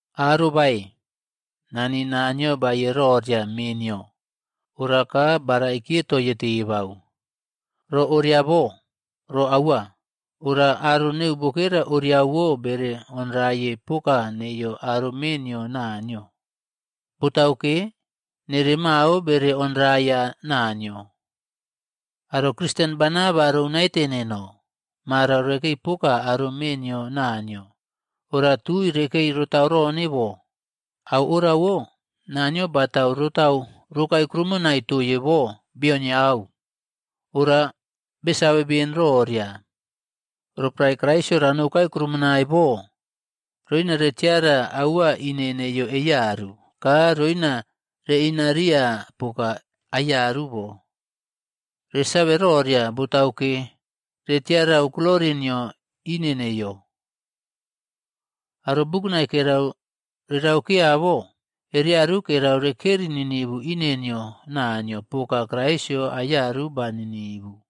Arobae! Nani Naniyo baeye roria mee nio, ora ka baraikiye toiye tebau. Ro oria bo, ro aua. Ora aro neu bokera oriawo bere onraye poka neiyo aro mee nio Naniyo. Botauke, nere mao bere onraiya Naniyo. Aro Kristen bana ba rou naite neno, marau rekei poka aro mee nio Naniyo. Ora tui rekei rotaurone bo, au orawo Naniyo batau rotau rokae kuroumonai toye bo beonyau. Ora besave beni roria, roporae Kraisꞌyo ranoukae krumonai bo, roina retiara aua ine neiyo eiyaru, ka roina reꞌinariya poka aiyaru bo. Resave roria, botauke, retiarau glori nio ine neiyo. Aro bukunai kerau reraukeya bo, ereyaru kerau rekeri ninivu ine nio Naniyo poka Kraisꞌyo aiyaru ba ninivu.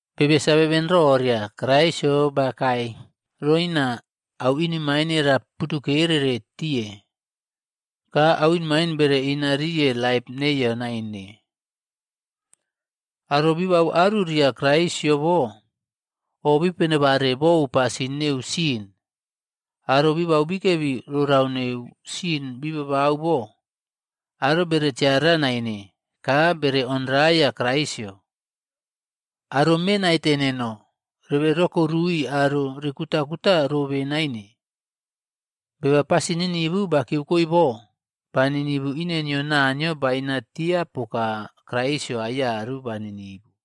Bebe save beni roria, Kraisꞌyo bakae roina au inemaine ra putukerere tiye. Ka au inemaine, bere inariye laip neiyo naine. Aro bibau aruriya Kraisꞌyo bo, o bipenebare bou pasin neu sin. Aro bibau bikebi rorau neu sin bibabau bo, aro bere tiara naine ka bere onraiya Kraisꞌyo. Aro me naite neno, rebe rokorui aro rikutakuta robe naine. Beba pasin ninivu bakiyeukoe bo, ba ninivu ine nio Naniyo bainatia poka Kraisꞌyo aiyaru ba ninivu.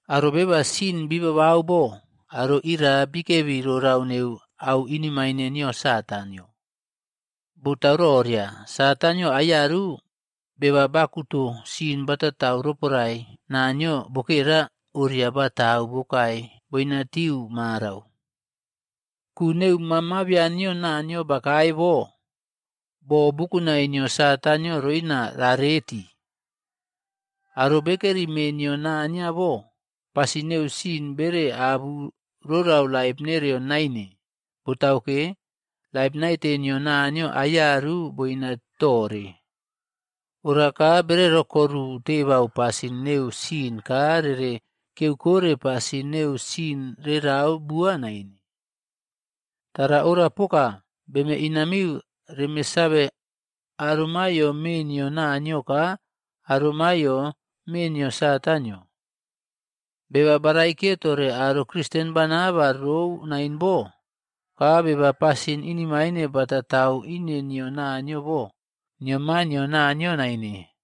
Aro beba sin bibau bo, aro ira bikebi rorau neu au inemaine nio Satanꞌyo.a Botau roria, Satanꞌyo aiyaru beba bakuto sin batatau roporae Naniyo bokera oria batau bokai boina tiu marau. Ku neu Maa Mabian nio Naniyo bakae bo, boo bukunae nio Satanꞌyo roina rareti. Aro bekeri mee nio Naniyo bo, pasin neu sin bere abu rorau laip nereo naine. Botauke, laip naite nio Naniyo aiyaru boina tore. Ora ka bere rokoru tebau pasin neu sin ka rere kiyeukore pasin neu sin rerau bua naine. Tara ora poka, beme inamiu reme save aro maiyo mee nio Naniyo ka aro maiyo mee nio Satanꞌyo. Beba baraikiye tore aro Kristen bana ba rou naine bo, ka beba pasin inemaine batautau ine nio Naniyo bo, nio maa nio Naniyo naine.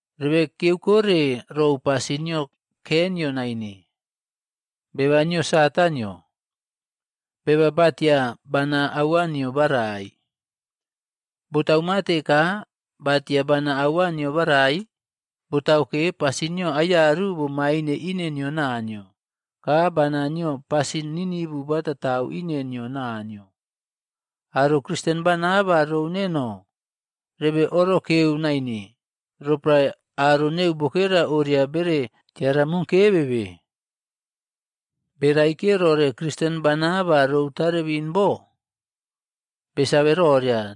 Rebe kiyakore rou pasin nio Keinꞌyo naine, beba nio Satanꞌyo. Beba batia bana aua nio barai. Botau mate ka batia bana aua nio barai? Botauke, pasin nio aiyaru bomaine ine nio Naniyo, ka bana nio pasin ninivu batatau ine nio Naniyo. Aro Kristen bana ba rou neno, rebe orokeu naine roporae aro neu bokera oriawo bere tiaramokevebe. Beꞌraikiye rore Kristen bana ba rou tarebin bo, besave roria,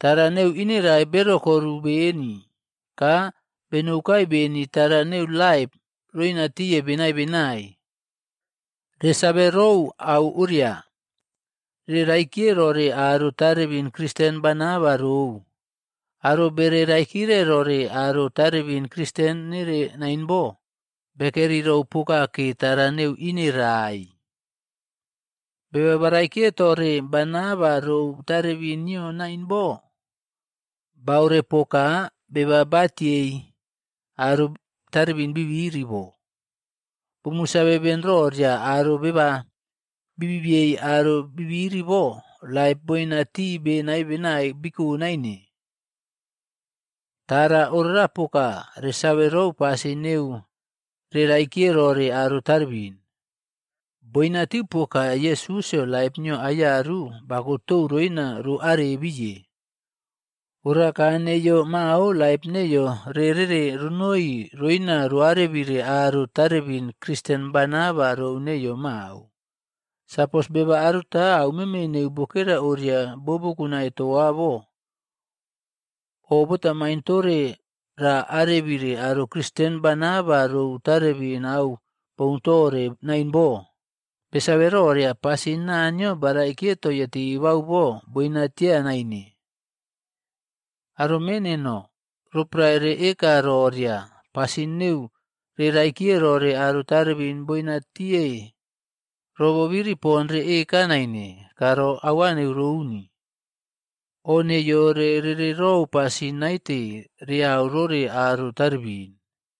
tara neu ineraai berokoru beni ka benoukae beni tara neu laip roinatiye benai benai. Resave rou au oria, re raikiye rore aro tarebin Kristen bana ba rou. Aro bere raikire rore aro tarebin Kristen nere naine bo, bekeri rou pokake tara neu ineraai. Beba baraikiye tore bana ba rou tarebin nio nain bo, baorepoka beba batiei aro tarebin bibiri bo. Bumu save ben roria aro beba bibiyei aro bibiri bo, laip boinatii benai benai biko naine. Tara orapoka resave rou pasin neu reꞌraikiye rore aro tarebin, boinatiu poka Yesusꞌyo laip nio aiyaru bakotou roina roarebiye. Oraka neiyo mao laip neiyo reꞌrere ronoi roina roꞌarebire aro tarebin Kristen bana ba rou neiyo mao. Sapos beba aruta aumeme neu bokera oria bobukunai toa bo oꞌbotamain tore raꞌarebire aro Kristen bana ba rou tarebin au boun tore naine bo, besave roria pasin Naniyo baraikiye toye tebau bo, boinatiya naine. Aro mee neno, roporae reꞌeka roria pasin neu reꞌraikiye rore aro tarebin boinatiye, ro bobiri poni reꞌeka naine ka ro aua neu rouni. O neiyo reꞌrere rou pasin naite reau rore aro tarebin.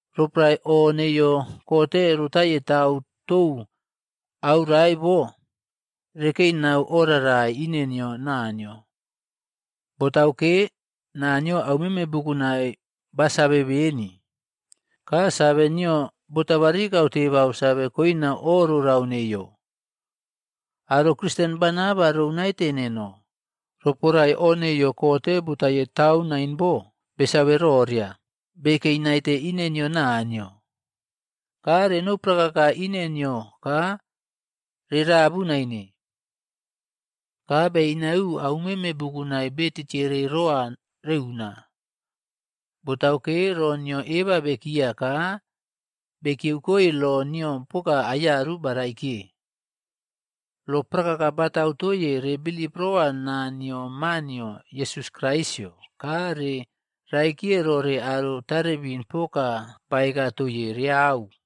Roporae o neiyo kote rotaiye tau tou aurae bo, rekei nau o rarai ine nio Naniyo. Botauke, Naniyo aumeme bukunai basave beni, ka save nio botabarikau tebau save koina o rorau neiyo. Aro Kristen bana ba rou naite neno, roporae o neiyo kote botaiye tau nain bo, besave roria bekei naite ine nio Naniyo. Ka renou prakaka ine nio ka rerabu naine. Ka be inayiu aumeme bukunai be tiꞌtiere rowa reuna. Botauke, ro nio eba bekiya ka bekiyeu koi lo nio poka aiyaru baraikiye. Lo prakaka batau toiye rere bilip rowa naa nio Ma nio Yesus Kraisꞌyo ka re raikire rore aro tarebin poka baeka toiye reyau.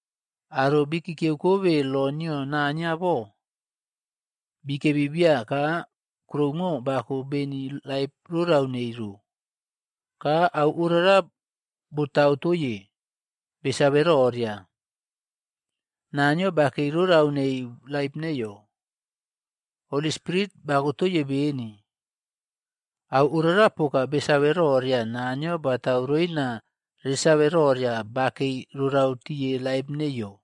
Aro bikikiyeu kobe lo nio Naniyo bo, bikebi biya ka kuroumo bako beni laip rorau nei ro. Ka au orara botau toiye, besave roria Naniyo bakei rorau neu laip neiyo. Holy Spirit bakotoiye beni. Au orapoka besave roria Naniyo batau roina resave roria bakei rorau tiye laip neiyo.